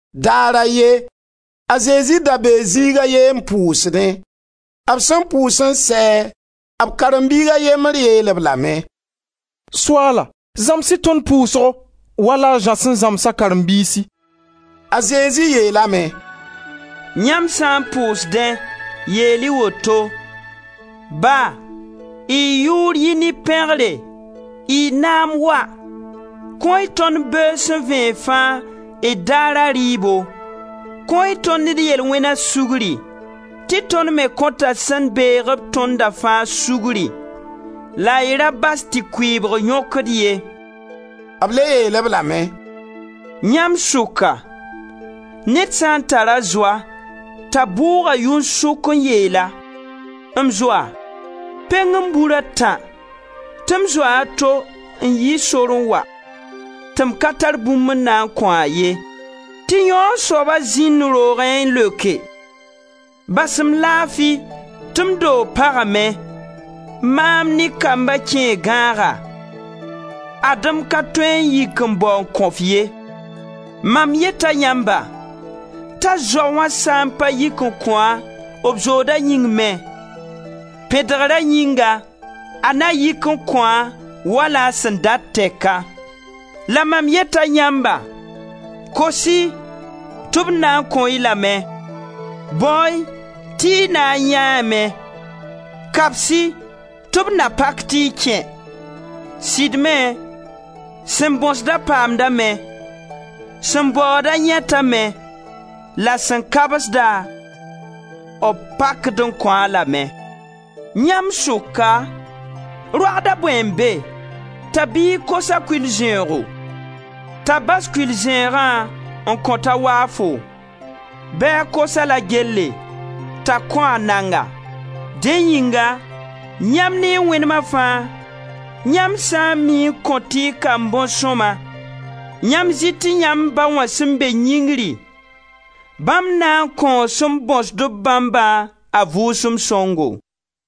Daar a ye, a Zezi da bee zĩig a ye n pʋʋsdẽ. B sẽn pʋʋs n sɛ, b karen-biig a yembr yeel-b lame: «Soaala, zãms-y tõnd pʋʋsgo wala a Zã sẽn zãms a karen-biisi.» A Zezi yeelame: «Yãmb sã n pʋʋsdẽ, yeel-y woto: ‹Ba, y yʋʋr yi ne pẽgre, y naam wa. Kõ-y tõnd beoog sẽn vẽeg fãa, d daara rɩɩbo. Kõ-y tõnd d yel-wẽna sugri, tɩ tõnd me kõta sẽn beeg-b tõnda fãa sugri la y ra bas tɩ kʋɩɩbg yõk-d ye.›» B le yeel-b lame: «Yãmb sʋka, ned sã n tar-a zoa t'a bʋʋg-a yʋn-sʋk n yeel-a: ‹M zoa, peng-m bur a tã, tɩ m zoa a to n yi sor n wa, tɩ m ka tar bũmb n na n kõ-a ye.› Tɩ yãoo soaba zĩnd roogẽ n leoke: ‹Bas-m laafi tɩ m doog pagame, maam ne kamba kẽe gãaga, ad-m ka tõe n yik n bao n kõ-f ye.› Mam yeta yãmba, t'a zoa wã sã n pa yik n kõ-a, b zooda yĩng me, pẽdgra yĩnga, a na yik n kõ-a wala a sẽn dat tɛka. La mam yeta yãmba: kos-y tɩ b na n kõ-y lame, bao-y tɩ y na n yãeeme; kabs-y tɩ b na pak tɩ y kẽ. Sɩd me, sẽn bõsd-a paamdame, sẽn baood-a yãetame la sẽn kabsd-a, b pakd n kõ-a lame. Yãmb sʋka, roagd a bõe n be t'a biig kos-a kʋɩl-zẽoogo, t'a bas kʋɩl-zẽegã n kõt-a waafo? Bɩ a kos-a la gelle, t'a kõ-a nanga? Dẽ yĩnga, yãmb ne y wẽnema fãa, yãmb sã n mii n kõt y kamb bõn sõma, yãmb zɩ tɩ yãmb Ba wã sẽn be yĩngri, bãmb na n kõo sẽn bõsd-b bãmbã a Vʋʋsem Sõngo!»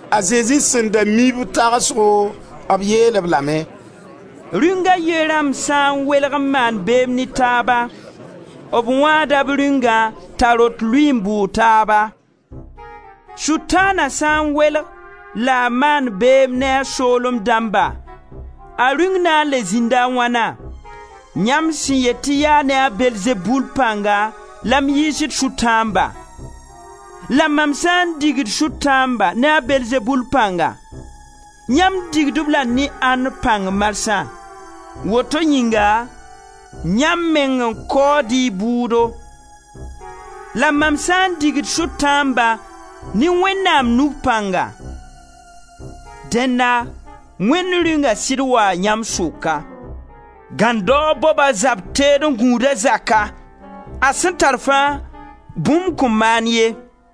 A Zezi sẽn da mi b tagsgo, b yeel-b lame: «Rĩung a ye rãmb sã n welg n maan beem ne taaba, b wãada b rĩungã t'a rot lʋɩ n bʋʋg taaba. Sʋtãana sã n welg la a maand beem ne a soolem dãmba, a rĩung na n le zĩnda wãna? Yãmb sẽn yet tɩ yaa ne a Beelzebul pãnga la m yiisd sʋtãamba, la mam sã n digd sʋtãamba ne a Beelzebul pãnga, yãmb digd-b la ne ãnd pãng marsã? Woto yĩnga, yãmb meng n kaood y bʋʋdo. La mam sã n digd sʋtãamba ne Wẽnnaam nug pãnga, dẽnna Wẽnd Rĩunga sɩd waa yãmb sʋka. Gãndaoog bob a zab teed n gũud a zaka, a sẽn tar fãa, bũmb kõn maan ye.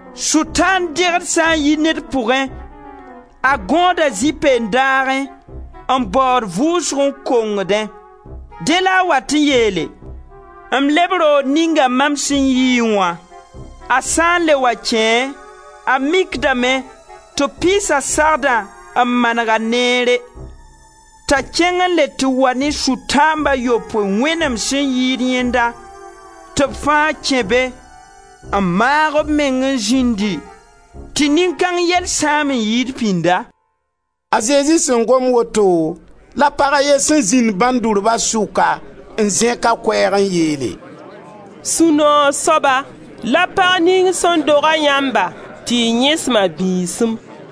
Sʋtãan dẽgd sã n yi ned pʋgẽ, a gõoda zĩ-peen-daagẽ n baood vʋʋsgo n kongdẽ. Dẽ la a wat n yeele: ‹M leb roog ninga mam sẽn yii wã.› A sã n le wa kẽe, a mikdame tɩ b pɩɩsa sagda n maneg-a neere; t'a kẽng n le tɩ wa ne sʋtãamb a yopoe wẽnem sẽn yɩɩd yẽnda, tɩ b fãa kẽ be n maag b meng n zĩndi tɩ nin-kãng yell sãam n yɩɩd pĩnda.» A Zezi sẽn gom woto, la pag a ye sẽn zĩnd bãndurba sʋka n zẽk a koɛɛg n yeele: «Sũ-noog soaba la pag ning sẽn tʋda y pʋga tɩ y yẽsem a bĩisim!»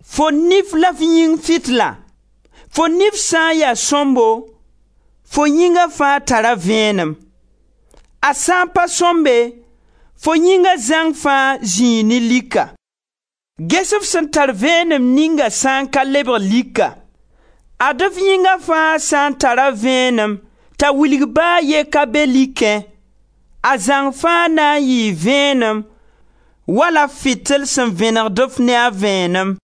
Fo nif la a f yĩng fitila, fo nif sã n ya sõmbo fo yĩnga fãa tara vẽenem; a sã n pa sõmbe, fo yĩnga zãng fãa zĩi ne lika. Ges f sẽn tar vẽenem ninga sã n ka lebg lika! Ad-f yĩnga fãa sã n tara vẽenem t'a wilg ba a ye ka be likẽ, a zãng faa na n yɩɩ vẽenem wala f fitil sẽn vẽnegd-f ne a vẽenem.»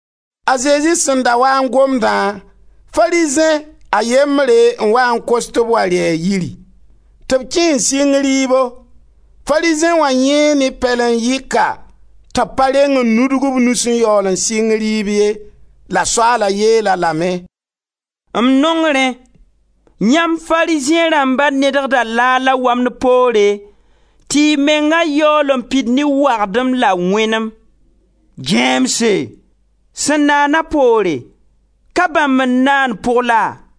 A Zezi sẽn da waa n gomdã, Farizẽ a yembre n waa n kos tɩ b wa rɩ a yiiri. Tɩ b kẽ n sɩng rɩɩbo. Farizẽ wã yãee ne pɛlen-yɩka tɩ b pa reng n nudg b nus n yaool n sɩng rɩɩb ye. La Soaala yeel-a lame: «M nong rẽ! Yãmb Farizẽ rãmba nedgda laag la wamd poore tɩ y menga yaool n pid ne wagdem la wẽnem. Gãeemse! Sẽn naana poore, ka bãmb n naan pʋg la?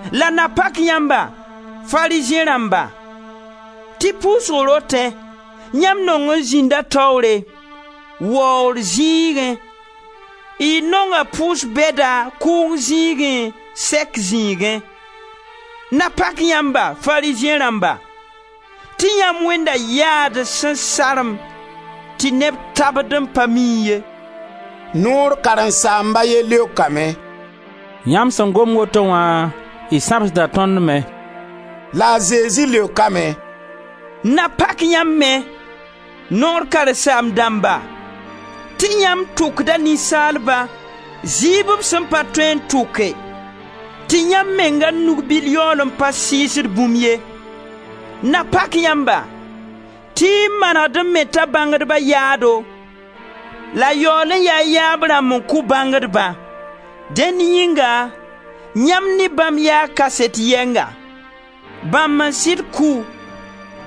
La na pak yãmba, Farizẽ rãmba! Tɩ pʋʋsg rotẽ yãmb nong n zĩnda taoore, waoor zĩigẽ, y nonga pʋʋs-bɛda kʋʋng zĩigẽ, sɛk zĩigẽ. Na pak yãmba, Farizẽ rãmba! Tɩ yãmb wẽnda yaad sẽn sarem tɩ neb tabd n pa mii ye!» Noor karen-saamb a ye leokame: «Yãmb sẽn gom woto wã, y sãbsda tõnd me.» La a Zezi leokame: «Na pak yãmb me, Noor karen-saam-dãmba! Tɩ yãmb tʋkda ninsaalba, zɩɩb b sẽn pa tõe n tʋke, tɩ yãmb menga nug-bil yaool n pa sɩɩsd bũmb ye. Na pak yãmba! Tɩ y manegd n meta bãngdba yaado la yaool n yaa y yaab rãmb n kʋ bãngdbã. Dẽnd yĩnga yãmb ne bãmb yaa kaset yɛnga: Bãmb n sɩd kʋ,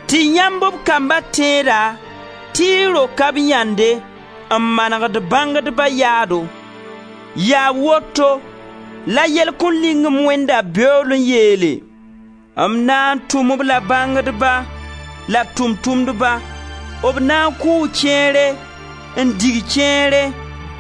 tɩ yãmb, b kamba, tẽeda tɩ y roka b yãnde, n manegd bãngdba yaado! Yaa woto la yell kõ-ling-m Wẽnda beool n yeele: M na n tʋm-b la bãngdba la tʋʋm-tʋmdba, b na n kʋʋ kẽere, n dig kẽere,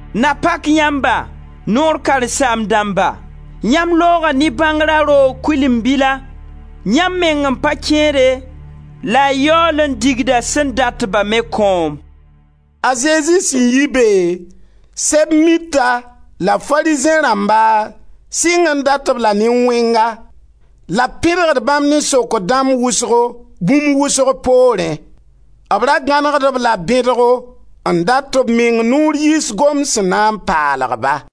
Na pak yãmba, Noor karen-saam-dãmba! Yãmb looga ne bãngra roog kʋɩlen-bila, yãmb meng n pa kẽede la y yaool n digda sẽn dat-ba me kõom.» A Zezi sẽn yi be, Sɛb-mita la Farizẽ rãmba sɩng n dat-b la ne wẽnga la b pẽdgd bãmb ne sokr dãmb wʋsgo, bũmb wʋsg poorẽ. B ra gãnegd-b-la bẽdgo, n dat tɩ b meng noor yiis gomd sẽn na n paalg-ba.